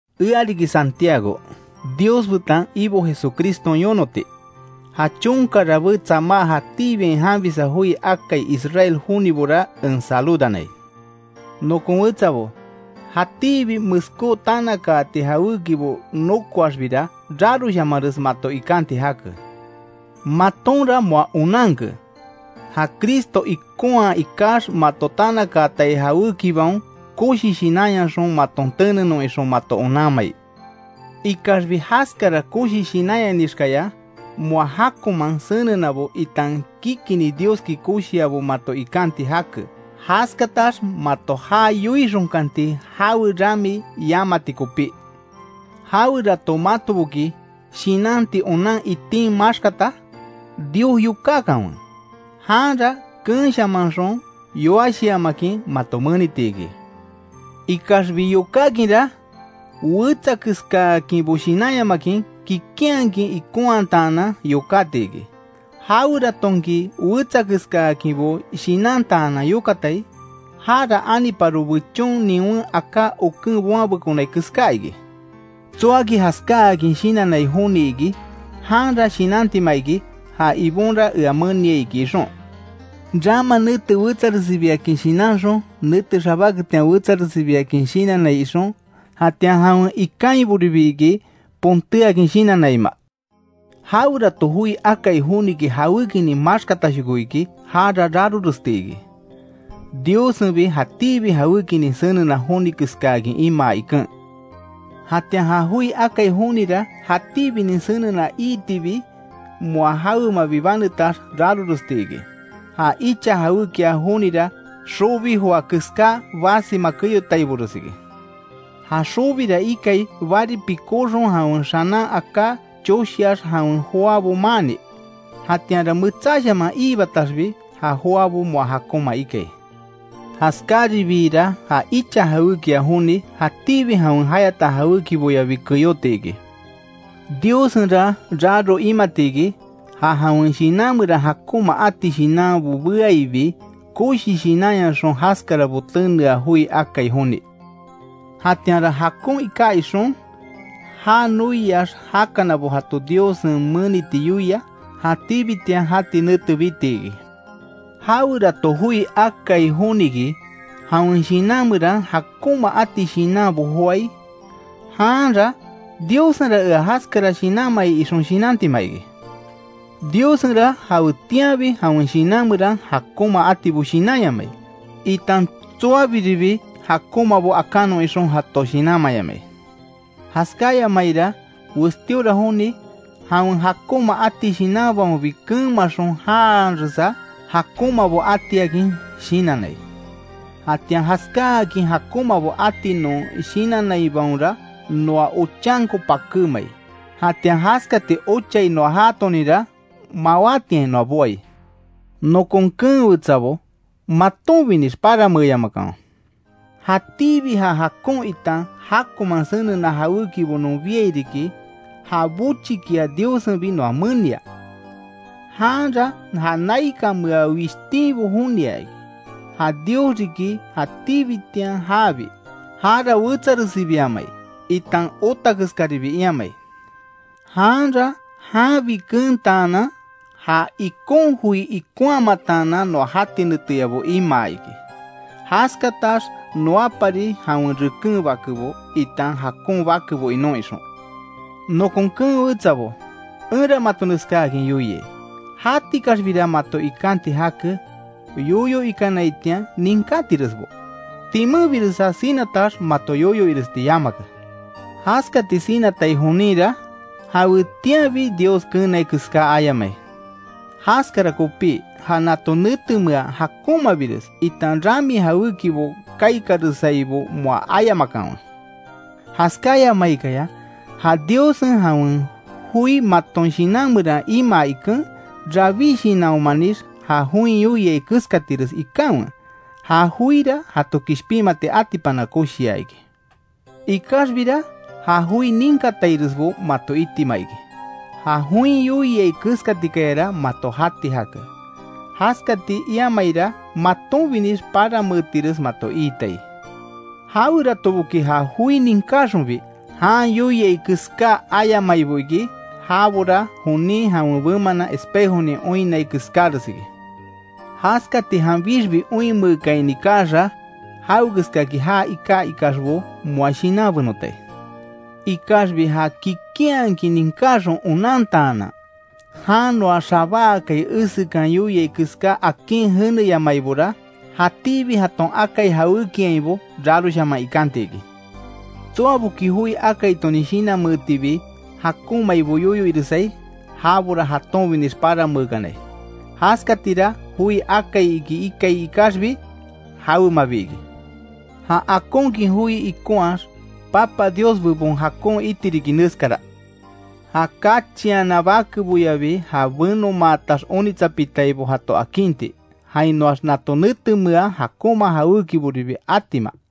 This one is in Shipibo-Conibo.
Ea riki Santiago, Dios betan Ibo Jesucriston yonoti. Ja chonka rabé tsamá jatíbiain janbisa joi akai Israel jonibora, en saludanai. Nokon wetsabo, jatíbi meskó tanakaati jawékibo nokoaxbira, raroshamares mato ikanti jake. Matonra moa onanke, ja Cristo ikonhaa ikax, mato tanakaatai jawékibaon, koshi shinanyaxon maton tenenon ixon mato onanmai. Ikaxbi jaskara koshi shinanyanixkaya, moa jákoman senenabo, itan kikini Dioski koshiabo mato ikanti jake, jaskatax mato ja yoixonkanti, jawe rami yamati kopí. Jawerato matoboki shinanti onan itin maxkata, Dios yokákanwe; janra keenshamanxon, yoashiamakin mato meniti iki. Ikaxbi yokákinra, wetsa keskaakinbo shinanyamakin kikinhakin ikonhataanan yokáti iki. Jaweratonki wetsakeskaakinbo shinantaanan yokatai, jara aniparo bechon niwen aká oken boanbekonai keská iki. Tsoaki jaskáakin shinannai joni iki, janra shinantima iki, ja Ibonra ea meniai iki ixon. Rama nete wetsaresibiakin shinanxon, nete xabáketian wetsaresibiakin shinannai ixon. Jatian jawen ikainboribi iki pontéakin shinannaima. Jawerato joi akai joniki jawékinin maxkatashoko iki jara raroresti iki, Diossenbi jatíbi jawékinin senena joni keskáakin imaa iken. Jatian ja joi akai jonira jatíbinin senena iitibi, moa jawemabi banetax raroresti iki. Ja icha jawékia jonira, xobi joa keska basima keyotaibores iki. Ja xobira ikai bari pikóxon jawen xanan aká choshiax jawen joabo maanni; jatianra metsáshaman iibataxbi, ja joabo moa jakonma ikai. Jaskáairibira ja icha jawékia joni, jatíbi jawen jayata jawékiboyabi keyóti iki. Diossenra raro imati iki, ja jawen shinan meran jakonma ati shinanbo beaibi, koshi shinanyaxon jaskarabo tenea joi akai joni; jatianra jakon iká ixon, já noiax jakanabo jato Diossen meniti yoia, jatíbitian jati nete biti iki. Jawerato joi akai joniki, jawen shinan meran jakonma ati shinanbo joái; janra Diossenra ea jaskara shinanmai ixon shinantima iki. Diossenra jawetianbi jawen shinan meran jakonma atibo shinanyamai, itan tsoabiribi jakonmabo akanon ixon jato shinanmayamai. Jaskáyamaira westíora joni, jawen jakonma ati shinanbaonbi keenmaxon janharesa, jakonmabo atiakin shinannai. Jatian jaskáakin jakonmabo ati non shinannaibaonra noa ochanko pakémai, jatian jaskati ochai noa jaatoninra mawátiain noa boai. Nokon keen wetsabo, matonbinix paranmeeyamakanwe. Jatíbi ja jakon itan jakonman senena jawékibo non biai riki, ja bochikia Diossenbi noa menia. Janra ja naikanmea wishtinbo jonia iki, ja Dios riki jatíbitian jabi, jara wetsaresibiamai, itan ota keskaribi iamai. Janra janbi keentaanan, ja ikon joi ikonhamataanan noa jati neteyabo imaa iki. Jaskatax noapari jawen reken bakebo, itan jakon bakebo inon ixon. Nokon keen wetsabo, enra mato neskáakin yoiai: Jatikaxbira mato ikanti jake, yoyo ikanaitian ninkátiresbo, timenbiresa sinatax, mato yoyo iresti yamake. Jaskati sinatai joninra, jawetianbi Dios keenai keská ayamai. Jaskara kopí ja nato netemea jakonmabires, itan rami jawékibo kaikaresaibo moa ayamakanwe. Jaskáyamaikaya ja Diossen jawen joi maton shinan meran imaa iken, rabí shinanhomanix ja join yoiai keskatires ikanwe, ja joira jato kishpinmati atipana koshia iki. Ikaxbira ja joi ninkatairesbo mato itima iki; ja join yoiai keskatikayara mato jati jake, jaskati iamaira, matonbinix paranmeetires mato iitai. Jaweratoboki ja joi ninkáxonbi, jan yoiai keská ayamaibo iki, jabora jonin jawen bemanan espejonin oinnai keskáres iki. Jaskati janbixbi oinmeekaini kaaxa, jaweskaki já iká ikaxbo moa shinanbenotai. Ikaxbi ja kikinhakin ninkáxon onantaanan, jan noa xabáakai esekan yoiai keská akin jeneyamaibora, jatíbi jaton akai jawékiainbo, raroshaman ikanti iki. Tsoaboki joi akaitonin shinanmeetibi jakonmaibo yoyo iresai; jabora jatonbinix paranmeekanai, jaskatira joi akai iki ikai ikaxbi, jawemabi iki. Ja akonkin joi ikonhaax, Papa Dios bebon jakon iti riki neskara: Ja kachiana bakeboyabi ja benomaatax onitsapitaibo jato akinti, jainoax nato netemea jakonma jawékiboribi atima.